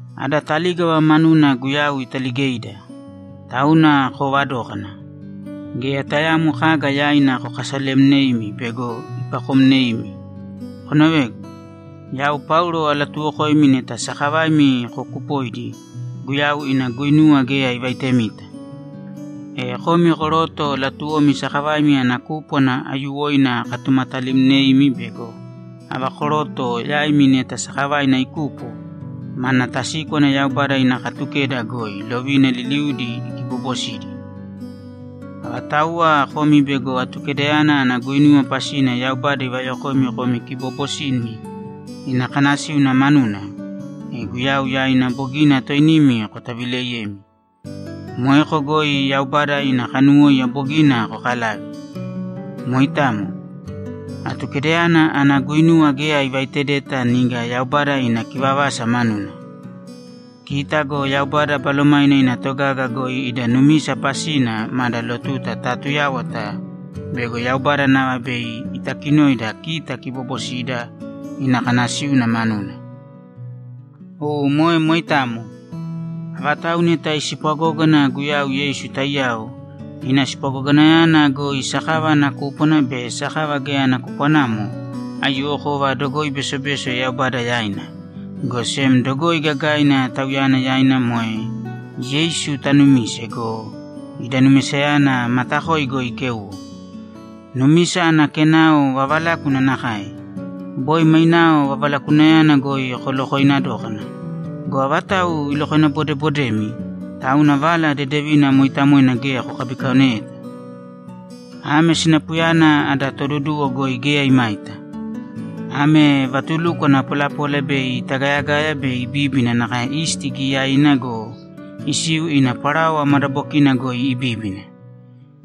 Ada talígava manuna Guyau italigeida! Tauna koovadōkana. Geya tayaamo kaga yaina kokasalemnēimi bego ipakomneimi. Konovēgu! Yau Paulo alatuwokoimi neta sakavaimi kokupoidi, Guyau ina guinuwa geya ivaitemita! E komi koroto latuwomi sakavaimi ana kúpwana aiyuwoina akatumatalimneimi bego ava koroto yaimi neta sakavaina ikupo, mana tasíkwana Yaubada ina Katukeda goi lovina liliudi ikibobosidi. Avatauwa komi bego Atukedayana ana guinuwa pasina Yaubada ivayokoimi komi kiboobosimi ina kanasíuna manuna, e Guyau yaina bogina toinimi kotavileiyemi. Moeko goi Yaubada ina kanuwóiya bogina kokalave. Moitamo. Atukedayana ana guinuwa geya ivaitedeta niga Yaubada ina kivavasa manuna. Kita go Yaubada Balomaina ina togaga goi ida numisa pasina mada lotuta taatuyáwata bego Yaubada nava bei itakinoida kita kiboobosida ina kanasíuna manuna. U moe moitamo. Avatau neta ispwagógana Guyau Yeisu taiyao, ina spwagoganayana goi sakava ana kúpwana be sakava geya ana kupwanamo, aiyuwokova dogoi besobeso Yaubada yaina, go sem dogoi gagaina Tauyana yaina moe Yeisu tanumise go, ida numisayana matakoi goi ikéuwo. Numisa ana kenao vavalákuna nakae. Boi mainao vavalakunayana goi kolokooina dókana. Go avatau ilokoinabodebodemi, tauna Vala Dedevina mooitamoina geya kokabikaoneyeta? Ame sinapuyana ada Toduduwo goi geya imaita! Ame vatulukwana polapola bei itagayagaya be ibíbina nakae isti giyaina go, isiu ina parawa madabokina goi ibíbina.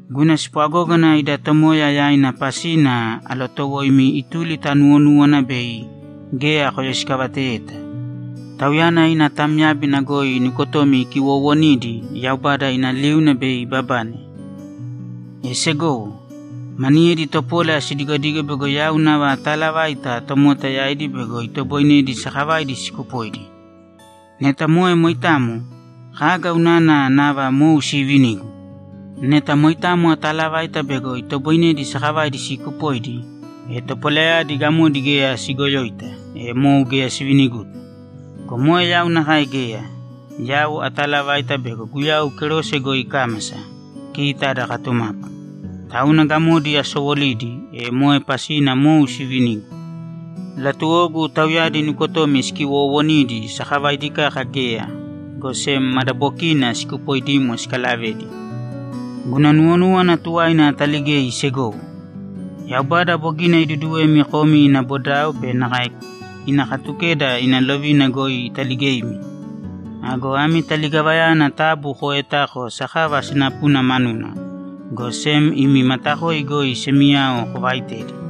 Guna spwagógana ida Tomoya yaina pasina alotowoimi ituli ta nuwonúwana bei geya koyoisikavateyeta. Tauyana ina tamyábina goi nukotomi ikiwoowonidi, Yaubada ina liuna bei ibabane. E segowo, maniyedi topola sidigodigo bego yau nava ataalavaita tomota yaidi bego itoboinedi sakavaidi sikupoidi. Neta moe moitamo, kaga unana nava mou siivinigu? Neta moitamo atalavaita bego itoboinedi sakavaidi sikupoidi, e topolayadi gamodi geya sigoyoita, e mou geya siviniguta. Go moe yau nakae geya. Yau atalavaita bego Guyau kerose goi ikámasa, kita ada katumapu. Tauna gamodi asowolidi, e moe pasina mou sivinigu. Latuwogu tauyadi nukotomi sikiwoowonidi sakavaidi kaka geya, go sem madabokiina sikupoidimo sikalavedi! Guna nuwonúwana tuwaina ataligei, segowo. Yaubada bogina iduduwemi komi ina bodao be nakae ina Katukeda ina lovina goi italigeimi. Ago ami taligavayana taabu kooetāko sakava sinapuna manuna, go sem imi matakoi goi semiyao kovaitēdi.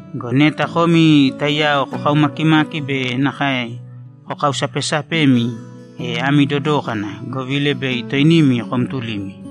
Go neta komi taiyao kokaumakimaki be nakae kokausapesapemi, e ami dodōkana, govila bei toinimi komtulimi.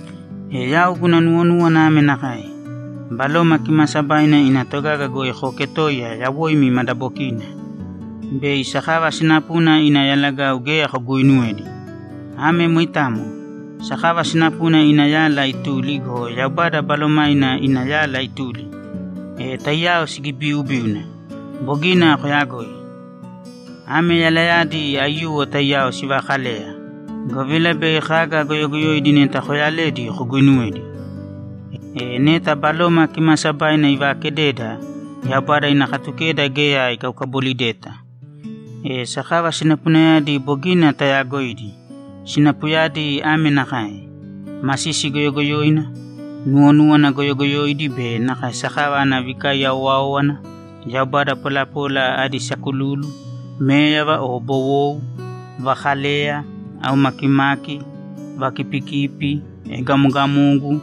E yau guna nuwonúwana ame nakae: Baloma Kimaasabaina ina togaga goi kooketōiya yawoim madabokina, bei sakava sinapuna ina yalagau geya koguuinuwedi. Ame moitamo. Sakava sinapuna ina yala ituli go, Yaubada Balomaina ina yala ituli, e taiyao sigibiubíuna. Bogina koyagoi. Ame yalayadi aiyuwo taiyao sivakaleya, govila bei kaga goyogoyoidi neta kooyaledi koguinuwedi. E neta Baloma Kimaasabaina ivaakededa, Yaubada ina Katukeda geya ikaukabolideta. E sakava sinapunayadi bogina tayaagoidi. Sinapuyadi ame nakae: Masisi goyogoyoina, nuwonúwana goyogoyoidi be nakae sakava ana vikaiya owáowana, yaubada polapola adi sakululu, méyava o bowou, vakaleya, aumakimaki, vakipikipi, egamogamogu,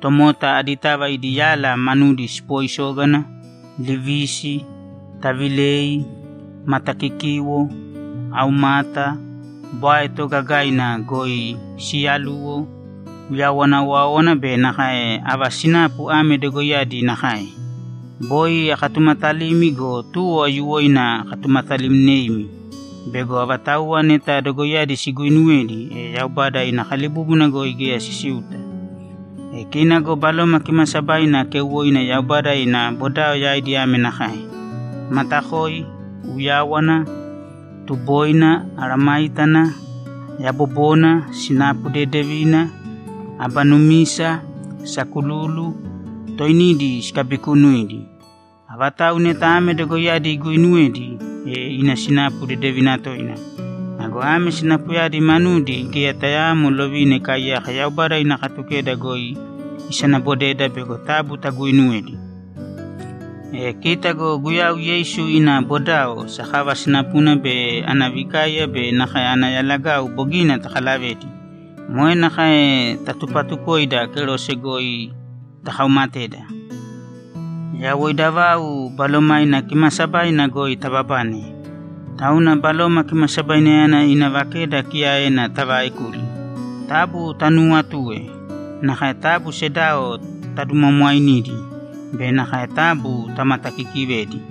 tomota aditava idi yala manudi sipoisógana, livisi, tavilei, matakikiwo, aumata, bwae toogagaina goi siyaluwo, uyawana owáowana be nakae ava sinapu ame dogoiyadi nakae. Boi akatumatalimi go, tuwo aiyuwoina akatumatalimneimi bego avatauwa neta dogoiyadi siguuinuwedi, e Yaubada ina kalibúbuna goi geya sisiuta. E kina go Baloma Kimaasabaina keuwoina Yaubada ina bodao yaidi ame nakae: Matakoi, uyáwana, tuboina, mesayágana, yabobona, sinapu dedevina, aba numisa, sakululu, toinidi sikabikunuidi. Avatau neta ame dogoiyadi iguuinuwedi, e ina sinapu dedevina toina. Ago ame sinapuyadi manudi geya tayaamo lovina ikaaiyaka Yaubada ina Katukeda goi isanabodeda bego taabu taguuinuwēdi. E kita go Guyau Yeisu ina bodao, sakava sinapuna be ana vikaiya be nakae ana yalagau bogina takalavedi; moe nakae tatupatukoidi kerose goi takaumatedi. Yawoida vau Balomaina Kimaasabaina goi taababane, tauna Baloma Kimasabainayana ina vakeda kiyaena tavaekūli. Taabu tanuuwatūe. Nakae taabu sedao tadumwaamwainīdi be nakae taabu tamatakiikivēdi.